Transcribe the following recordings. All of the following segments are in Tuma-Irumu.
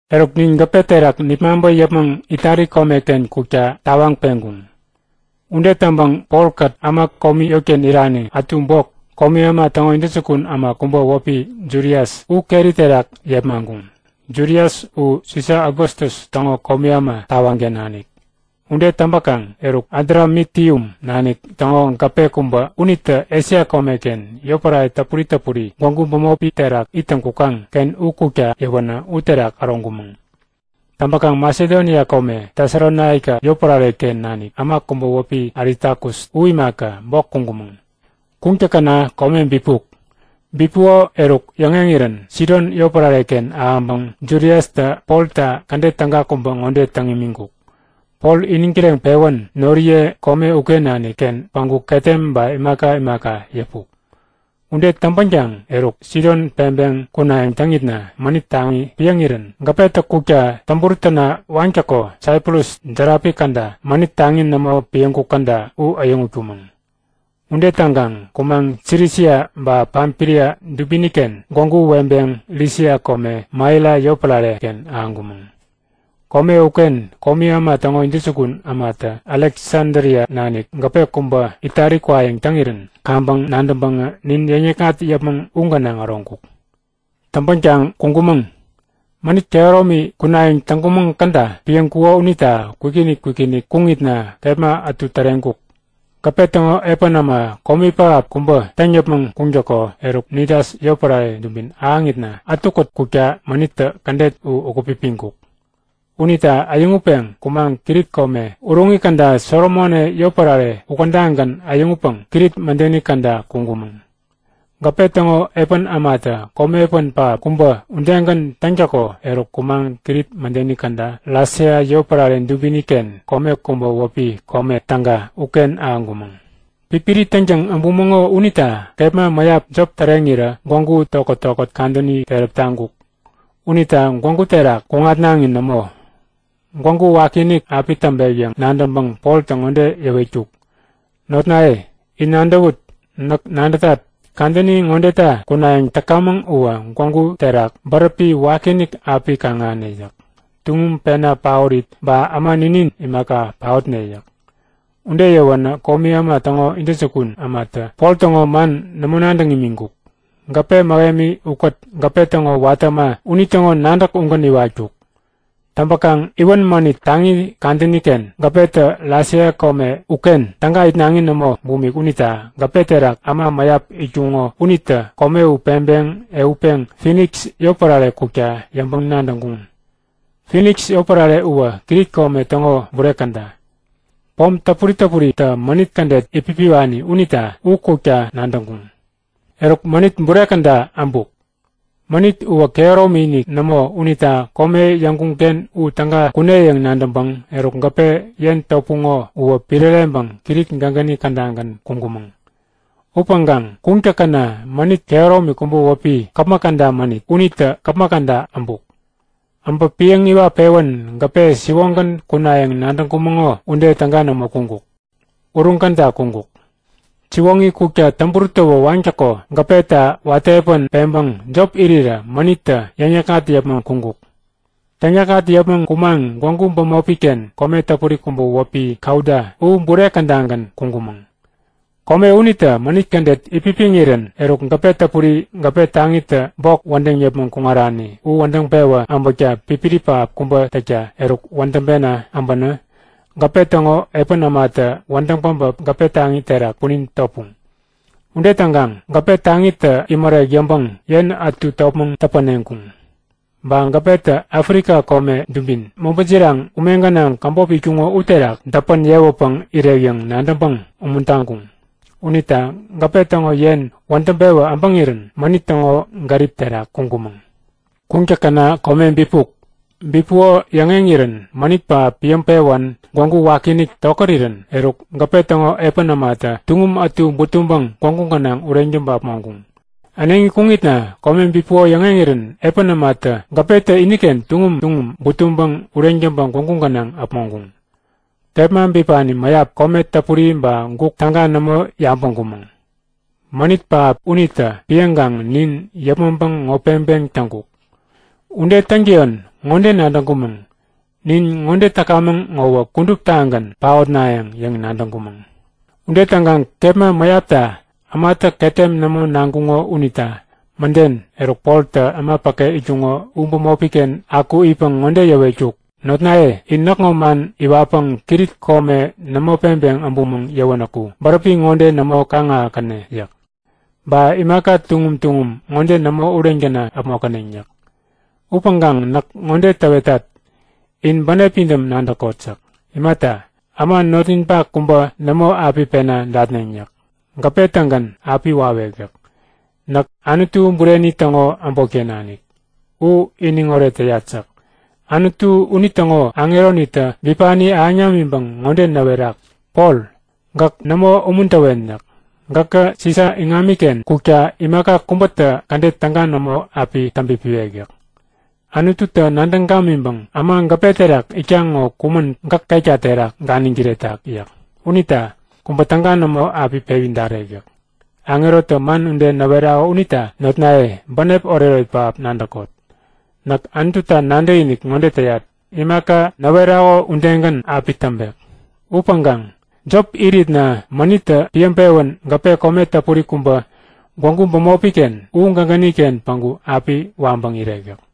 Eruk, nin gäpe terak nipmaŋpä yäpmäŋ Itali komeken kukta tawaŋ peŋkuŋ. Ude täŋpäŋ Polkät äma komi yotken irani ätu bok komi äma täŋo intäjukun äma kubä wäpi Julius u keri terak yepmaŋkuŋ. Julius u Sisa Augustus täŋo komi äma tawaŋken nanik. Ude täŋpäkaŋ eruk, Adramitium nanik täŋo gäpe kubä unitä Esia komeken, yotpärare täpuri täpuri gwägu pomi terak ittäŋ kukaŋ-ken u kukta yäwänä uterak äroŋkumäŋ. Täŋpäkaŋ Masedonia kome, Tesalonaika yotpärare-ken nanik äma kubä wäpi Aristakus u imaka, bok kuŋkumäŋ. Kuŋtäkäna kome bipuk. Bipuko eruk yäŋeŋirän Sidon yotpärare-ken ahäŋpäŋ Juliustä Polta kädet täga kubä ŋode täŋ imiŋkuk; Pol iniŋ kireŋpewän noriye kome uken nanikken päŋku ketem ba imaka imaka yäpuk. Ude täŋpänkaŋ eruk, Sidon peŋpeŋ kunayäŋ täŋitna mänit taŋi piäŋirän gäpetä kukta täŋburut täna waŋtäko Saiprus järapi käda, mänit taŋi nämo piäŋkuk käda u äyäŋutkumäŋ. Ude täŋkaŋ kumaŋ Silisia ba Pamfilia dubini-ken gwägu weŋpeŋ Lisia kome Maira yotpärare-ken ahäŋkumäŋ. Kome uken komi äma täŋo intäjukun ämatä Aleksadria nanik gäpe kubä Itali kwayäŋ täŋirän kaŋpäŋ nadäŋpäŋä nin yäŋnikŋat yäpmäŋ u gänaŋ äroŋkuk. Täŋpänkaŋ kuŋkumäŋ. Mänit kehäromi kunayäŋ täŋkumäŋ käda piäŋkuko unita kwikinik kwikinik kuŋitna kepma ätu täreŋkuk. Gäpe täŋo epän äma komi pähap kubä täŋ yäpmäŋ kuŋtäko eruk, Nidas yotpärare dubin ahäŋitna, ätukät kukta mänittä kädet u ukät-pipiŋkuk. Unita äyäŋutpeŋ kumaŋ Krit kome uruŋi käda Salmone yotpärare ukädagän äyäŋutpäŋ Krit mädeni käda kuŋkumäŋ. Gäpe täŋo epän ämatä komi epän pähap kubä udegän täŋtäko eruk kumaŋ Krit mädeni käda Lasea yotpärare dubini-ken kome kubä wäpi Kome Täga uken ahäŋkumäŋ. Pipiri täŋtäŋ äbumäŋo unita kepma mäyap jop täreŋirä gwägu tokät-tokät kadäni keräp taŋkuk unita gwägu terak kuŋatnaŋi nämo. Gwägu wakiinik api täŋpek yäŋ nadäŋpäŋ Poltä ŋode yäwetkuk; Notnaye, in nadäwut! Näk nadätat, kadäni ŋodeta kunayäŋ täkamäŋ uwä gwägu terak bäräpi wakiinik api kaŋ-ahäne yäk. Tuŋum pena paorit ba äma ninin imaka, paotne yäk. Ude yäwänä komi äma täŋo intäjukun ämatä Pol täŋo man nämo nadäŋ imiŋkuk. Gäpe mähemi ukät gäpe täŋo watä äma unitäŋo nadäk ugän iwatkuk. Täŋpäkaŋ iwän mänit taŋi kadäni-ken gäpetä Lasea kome uken täga itnaŋi nämo bumik unita gäpe terak äma mäyap itkuŋo unitä kome u peŋpäŋ ehutpeŋ Finiks yotpärare kukta yäŋpäŋ-nadäŋkuŋ. Finiks yotpärare uwä Krit kome täŋo bure käda, pom täpuri täpuritä mänit kädet itpipiwani unita u kukta nadäŋkuŋ. Eruk mänit bure käda äbuk. Mänit uwä kehäromi-inik nämo unita kome yäŋkuŋ-ken u täga kune yäŋ nadäŋpäŋ eruk gäpe yen topuŋo uwä piräreŋpäŋ Krit gägäni kädagän kuŋkumäŋ. Upäŋkaŋ kuŋtäkäna mänit kehäromi kubä wäpi Käpmäk Käda Mänit unitä käpmäk käda äbuk. Äbä piäŋ-iwat-pewän gäpe siwoŋgän kunayäŋ nadäŋkumäŋo ude täga nämo kuŋkuk. Uruŋ käda kuŋkuk. Siwoŋi kukta täŋburut tawä waŋtäko gäpeta watä epän peŋpäŋ jop irirä mänittä täŋyäkŋat yäpmäŋ kuŋkuk. Täŋyäkŋat yäpmäŋ kumaŋ gwägu bämopi-ken kome täpuri kubä wäpi Kauda u bure kädagän kuŋkumäŋ. Kome unitä mänit kädet itpipiŋirän eruk gäpe täpuri gäpe taŋitä bok wädäŋ yäpmäŋ kuŋarani u wädäŋ pewä äbäkta pipiri pähap kubä täŋkä eruk wädäŋpena äbänä gäpe täŋo epän ämatä wädäŋ päbä gäpe taŋi terak punin topuŋ. Ude täŋkaŋ gäpe taŋitä imärek yäŋpäŋ yen ätu topmäŋ täpäneŋkuŋ. Ba gäpetä Afrika kome dubin mobä jiraŋ ume gänaŋ käbop itkuŋo uterak däpän yewäpäŋ irek yäŋ nadäŋpäŋ umuntaŋkuŋ. Unita gäpe täŋo tek wädäŋpewä äpäŋirän mänit täŋo gärip terak kuŋkumäŋ. Kuŋtäkäna kome bipuk. Bipuko yäŋeŋirän mänit pähap piäŋpewän gwägu wakiinik tokärirän eruk, gäpe täŋo epän ämatä tuŋum ätu butuŋpäŋ gwägu gänaŋ ureŋ täŋpä äpmoŋkuŋ. Äneŋi kuŋitna kome bipuko yäŋeŋirän epän ämatä gäpetä iniken tuŋum tuŋum butuŋpäŋ ureŋ täŋpä gwägu gänaŋ äpmoŋkuŋ. Kepma bipani mäyap kome dapuri ba guk täga nämo yabäŋkumäŋ. Mänit pähap unitä piäŋkaŋ nin yäpmäŋpäŋ ŋo peŋpeŋ täŋkuk. Ude täŋtäyon ŋode nadäŋkumäŋ; Nin ŋode täkamäŋ ŋowä kuduptagän paotnayäŋ yäŋ nadäŋkumäŋ. Ude täŋkaŋ kepma mäyapta ämatä ketem nämo naŋkuŋo unita mäden, eruk Poltä äma päke itkuŋo u bämopi-ken aku itpäŋ ŋode yäwetkuk; Notnaye, in näkŋo man iwatpäŋ Krit kome nämo peŋpeŋ äbumäŋ yäwänäku bäräpi ŋode nämo kaŋ-ahäkäne yäk. Ba imaka tuŋum tuŋum ŋode nämo ureŋ täna äpmokäneŋ yäk. Upäŋkaŋ näk ŋode täwetat; In bänep pidäm nadäkot yäk. Imata, äma notninpak kubä nämo api pena datneŋ yäk. Gäpe-tägän api wawek yäk. Näk Anutu bureni täŋo äbotken nanik. U iniŋoret täyat yäk. Anutu unitäŋo aŋeronitä bipani ahäŋ namiŋpäŋ ŋode näwerak; Pol, gäk nämo umuntäwen yäk. Gäkä Sisa iŋamiken kukta imaka kubätä kädet täga nämo api täŋpipiwek yäk. Anututä nadäŋ gamiŋpäŋ äma gäpe terak itkaŋ ŋo kumän gäk ketka terak ganiŋ kiretak yäk. Unita kubä täga nämo api pewi darek yäk. Aŋerotä man ude näwerako unita notnaye, bänep oretoret pähap nadäkot! Näk Anututa nadäkinik ŋode täyat; Imaka näwerako udegän api täŋpek. Upäŋkaŋ jop iritna mänittä piäŋpewän gäpe kome täpuri kubä gwägu bämopi-ken u gägäni-ken päŋku api waŋpäŋ irek yäk.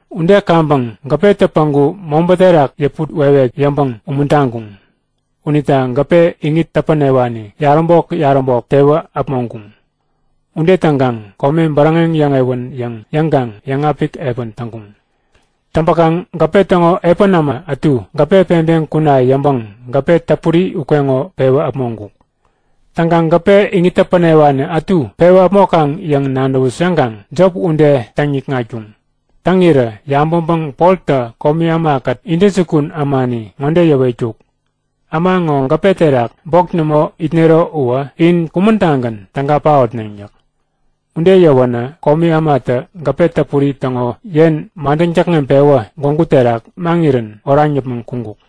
Ude kaŋpäŋ gäpetä päŋku mobä terak yäput wekwek yäŋpäŋ umuntaŋkuŋ. Unita gäpe iŋit täpänewani yaräbok-yaräbok tewä äpmoŋkuŋ. Ude täŋkaŋ kome bäräŋeŋ yäŋewän yäŋ yäŋkaŋ yäŋapik epän täŋkuŋ. Täŋpäkaŋ gäpe täŋo epän äma ätu gäpe peŋpeŋ kuna yäŋpäŋ gäpe täpuri ukeŋo pewä äpmoŋkuk. Täŋkaŋ gäpe iŋit täpänewani ätu pewä äpmokaŋ yäŋ nadäwut yäŋkaŋ jop ude täŋ-nikŋatkuŋ. Täŋirä yabäŋpäŋ Poltä komi ämakät intäjukun ämani ŋode yäwetkuk; Äma ŋo gäpe terak bok nämo itnero uwä in kumän-tagän täga paotneŋ! yäk. Ude yäwänä komi ämatä gäpe täpuri täŋo yen madäŋ täkŋeŋpewä gwägu terak maŋirän oraŋ yäpmäŋ kuŋkuk.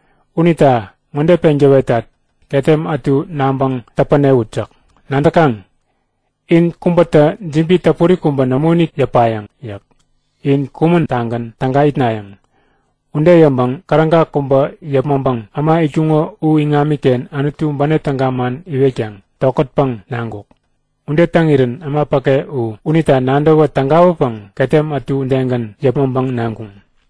Unita ŋode peŋ täwetat; Ketem ätu naŋpäŋ täpänewut yäk. Nadäkaŋ? In kubätä jibi täpuri kubä nämoinik yäpayäŋ yäk. In kumän-tagän täga itnayäŋ. Ude yäŋpäŋ käräga kubä yäpmäŋpäŋ äma itkuŋo u iŋamiken Anutu bänep täga man iwetkaŋ tokätpäŋ naŋkuk. Ude täŋirän äma päke u, unita nadäwä tägawäpäŋ ketem ätu udegän yäpmäŋpäŋ naŋkuŋ.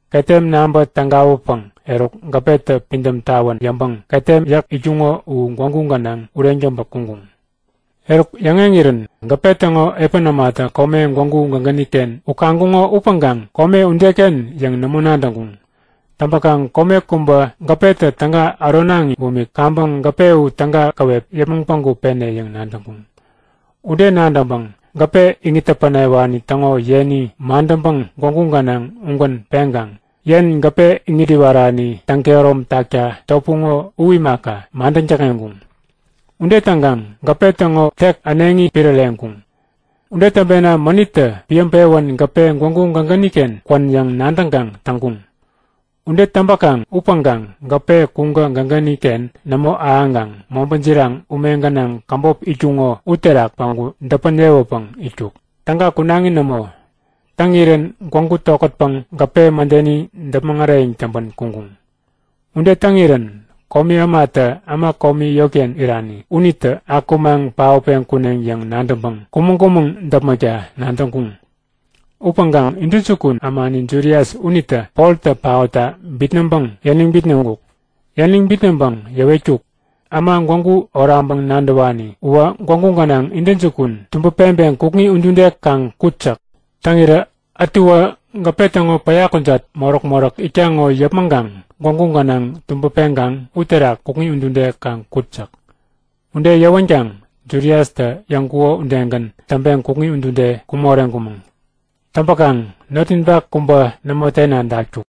Ketem naŋpä tägawäpäŋ eruk gäpetä pidäm tawän yäŋpäŋ ketem yäk ätu itkuŋo u gwägu gänaŋ ureŋ täŋpä kuŋkuŋ. Eruk yäŋeŋirän gäpe täŋo epän ämatä kome gwägu gägäni-ken u kaŋkuŋo upäŋkaŋ kome udeken yäŋ nämo nadäŋkuŋ. Täŋpäkaŋ kome kubä gäpetä täga äronaŋi bumik kaŋpäŋ gäpe u täga käwep yäpmäŋ päŋku pene yäŋ nadäŋkuŋ. Ude nadäŋpäŋ gäpe iŋit täpänewani täŋo yeni madäŋpäŋ gwägu gänaŋ ugän peŋkaŋ yen gäpe iŋit iwarani täŋkehärom takta topuŋo u imaka, madäŋ täkŋeŋkuŋ. Ude täŋkaŋ gäpe täŋo tek äneŋi piräreŋkuŋ. Ude täŋpena mänittä piäŋpewän gäpe gwägu gägäni-ken kwän yäŋ nadäŋkaŋ täŋkuŋ. Ude täŋpäkaŋ upäŋkaŋ gäpe kuŋkä gägäni-ken nämo ahäŋkaŋ mobä jiraŋ ume gänaŋ käbop itkuŋo uterak päŋku däpän yewäpäŋ itkuk, täga kunaŋi nämo. Täŋirän gwägu tokätpäŋ gäpe mädeni däpmäŋ äreyäŋ täŋpän kuŋkuŋ. Ude täŋirän komi ämatä äma komi yotken irani unitä akumaŋ paotpeŋ kuneŋ yäŋ nadäŋpäŋ kumäŋ-kumäŋ däpmäkta nadäŋkuŋ. Upäŋkaŋ intäjukun ämani Julius unitä Poltä paotta bitnäŋpäŋ yäniŋ bitnäŋkuk. Yäniŋ bitnäŋpäŋ yäwetkuk; Äma gwägu oraŋpäŋ nadäwani uwä gwägu gänaŋ intäjukun tubäpeŋpeŋ kukŋi udude kaŋ kut yäk. Täŋirä ätuwä gäpe täŋo päya kujat moräk-moräk itkaŋ ŋo yäpmäŋkaŋ gwägu gänaŋ tubäpeŋkaŋ uterak kukŋi udude kaŋ kut yäk. Ude yäwänkaŋ Juliustä yäŋkuko udegän täŋpeŋ kukŋi udude kuŋ moreŋkumäŋ. Täŋpäkaŋ notninpak kubä nämo tena datkuk.